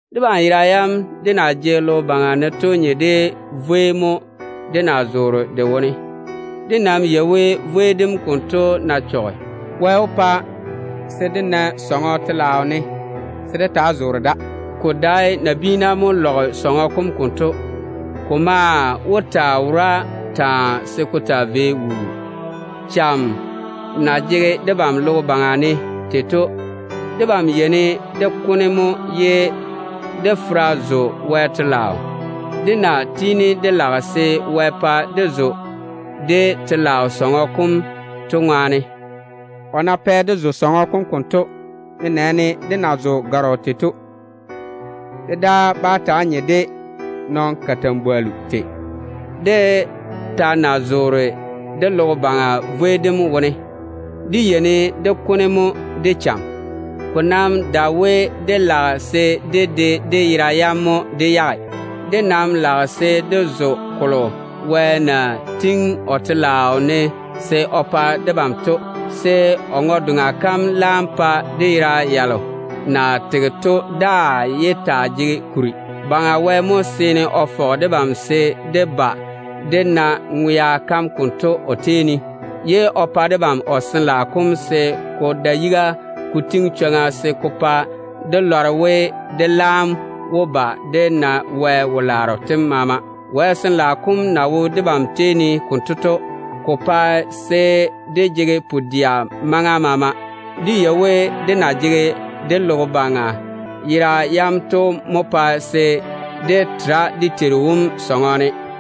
Debam yera yam dé na jege logo baŋa ne to nye de vwei mo dé na zoore de wone. Dé nam yei we, vwei dem konto ná chɔge, Wɛ wó pa dé na sɔŋɔ telaao ne se dé taa zoore da. Ko dae nabiina mo lɔge sɔŋɔ kom konto. Ko maa wó taa wora taa se ko taa vei wuu. Cham na jege debam logo baŋa ne tei to, debam yeini dé kone mo ye dé fera zo Wɛ telaao, dé na tiini dé lage se Wɛ pa dé zo dé telaao sɔŋɔ kom to ŋwaane. O ná pɛ dé zo sɔŋɔ kom konto, nenɛɛne dé na zo gɔrɔ tei to, dé daa bá taa nye de nɔn-kalambwollu tei. Dé ta ná zoore dé logo baŋa vwei dem wone, dé yeini dé kone mo de cham. Ko nam dae we dé lage se dé de dé yera yam mo dé yage. Dé nam lage se dé zo kolo Wɛ na tiŋi o telaao ne se o pa debam to, se o ŋwe-doŋa kam laam pa dé yera yalo na tege to daa yé taa jege kuri. Baŋa Wɛ mo seene o fɔge debam se dé ba dé na ŋwea kam konto o tei ne, ye o pa debam o Sin-laao kom se ko da yiga ko tiŋi chwoŋa se ko pa dé lɔre we, dé laam wó ba dé na Wɛ wo-laaro tem maama. Wɛ Sin-laao kom na wo debam tei ne konto to, ko pa se dé jege pu-dɛa maŋa maama. Dé yei we, dé na jege dé logo baŋa yera yam to mo pae se dé tera dé Teiru wom sɔŋɔ ne.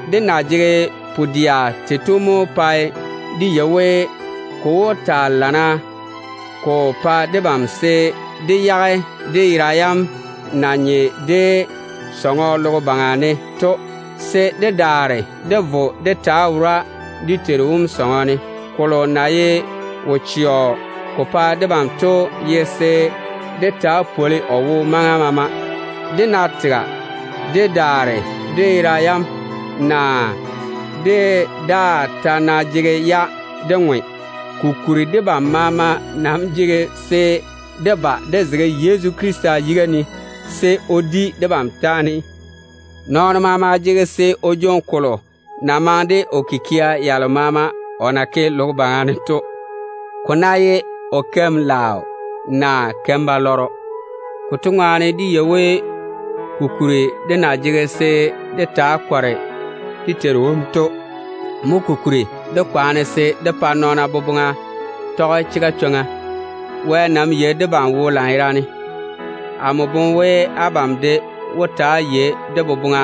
Dé na jege pu-dɛa tei to mo pae dé yei we, ko wó taa lamma ko pa debam se dé yage dé yera yam na nye de dé sɔŋɔ logo baŋa ne to, se dé daare dé vo dé taa wora dé Teiru wom sɔŋɔ ne. Kolo na ye wo-chɛɔ ko pa debam to ye se dé taa pwoli o wo maŋa maama, nenɛɛne de ná tega dé daare dé yera yam, naa dé daa ta ná jege-ya dé ŋwe. Kokuri debam maama nam jege se dé ba dé zege Yezu Krista yiga ne, se o di debam taane. Nɔɔno maama jege se o jwoŋi kolo na maŋe de o kikia yalo maama o na ke logo baŋa ne to, ne ko ná ye o ke keim-laaro, naa o ke keim-balwaaro. Konto ŋwaane dé yei ko kuri dé na jege se dé taa kɔre dé Teiru wom to. Mo kokuri dé kwaana se dé pa nɔɔna boboŋa tɔge chega chwoŋa. Wɛ nam yei debam wo lanyerane. Amo boŋe we abam de wó ta‑á yei dé boboŋa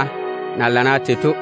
na lana tei to.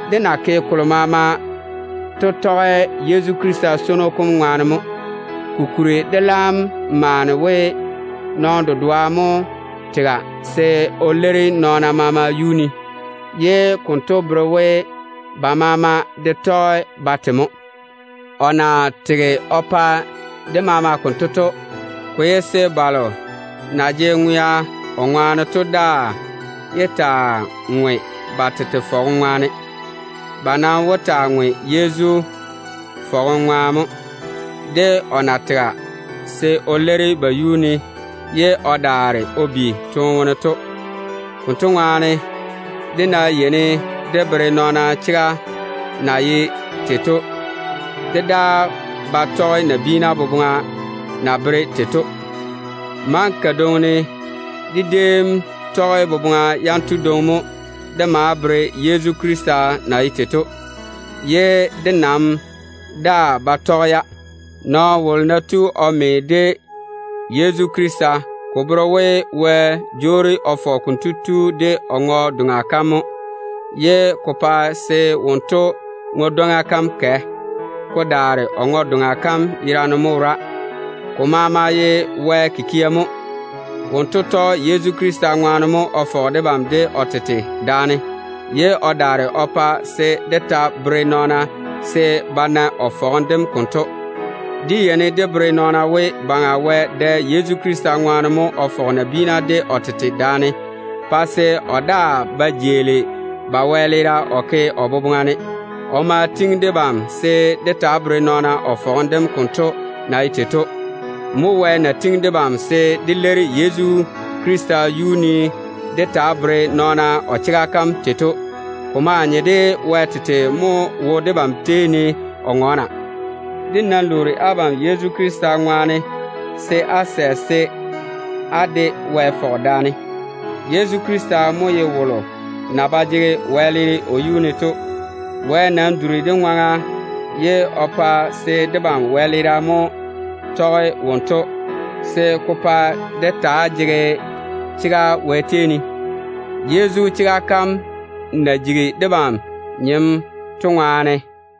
Dé na ke kolo maama to tɔge Yezu Krista swono kom ŋwaane mo. Kokuri dé laam maane we, nɔɔno dedoa mo tega se o leiri nɔɔna maama yuu ne, ye konto bere we ba maama de tɔge ba te mo. O na tege o pa ba maama konto to, ko ye se balo na jege ŋwea o ŋwaane to mo daa yé taa ŋwe ba tete fɔgem ŋwaane. Ba nam wó taa ŋwe Yezu fɔgem ŋwaane mo, de o na tega se o leiri ba yuu ne ye o daare o bi toone wone to. Konto ŋwaane, dé ná yeini dé bere nɔɔna chega na ye tei to, dé daa ba tɔge nabiina boboŋa na bere tei to. Maŋa kadwoŋi ne dé déem tɔge boboŋa yanto dwoŋi mo dé maa bere Yezu Krista na ye tei to, ye dé nam daa ba tɔge-ya. Nɔɔno wolo ná tu o me de Yezu Krista, ko bere we, Wɛ jwoori o fɔge konto tu de o ŋwe-doŋa kam mo, ye ko pa se wonto ŋwe-dwoŋa kam kɛ, ko daare o ŋwe-doŋa kam yerane mo wora. Ko maama ye Wɛ kikia mo. O tɔge Yezu Krista ŋwaane mo o fɔge debam de o tete daane, ye o daare o pa se dé taa woli nɔɔna se ba na o fɔgem dem konto. Dé yeini dé bere nɔɔna we, Baŋa Wɛ dɛ Yezu Krista ŋwaane mo o fɔge nabiina de o tete daane, pa se o daa ba jeeli ba wɛleera o ke o boboŋa ne. O ma kuri debam se dé taa bere nɔɔna o fɔgem dem konto na ye tei to. Mo Wɛ na tiŋi debam se dé leiri Yezu Krista yuu ne dé taa bere nɔɔna o chega kam tei to. Ko maa nye de Wɛ tete mo wo debam tei ne o ŋɔɔna. Dé nam lwoori abam Yezu Krista yere ŋwaane se á sɛ se á de Wɛ fɔge daane. Yezu Krista mo ye wolo na ba jege wɛleere o yuu ne to. Wɛ nam duri dé ŋwaŋa ye o pa se debam wɛleera mo saŋe wonto yuu ne, se ko pa dé taa jege chega Wɛ tei ne, dé na me de Yezu to ŋwaane.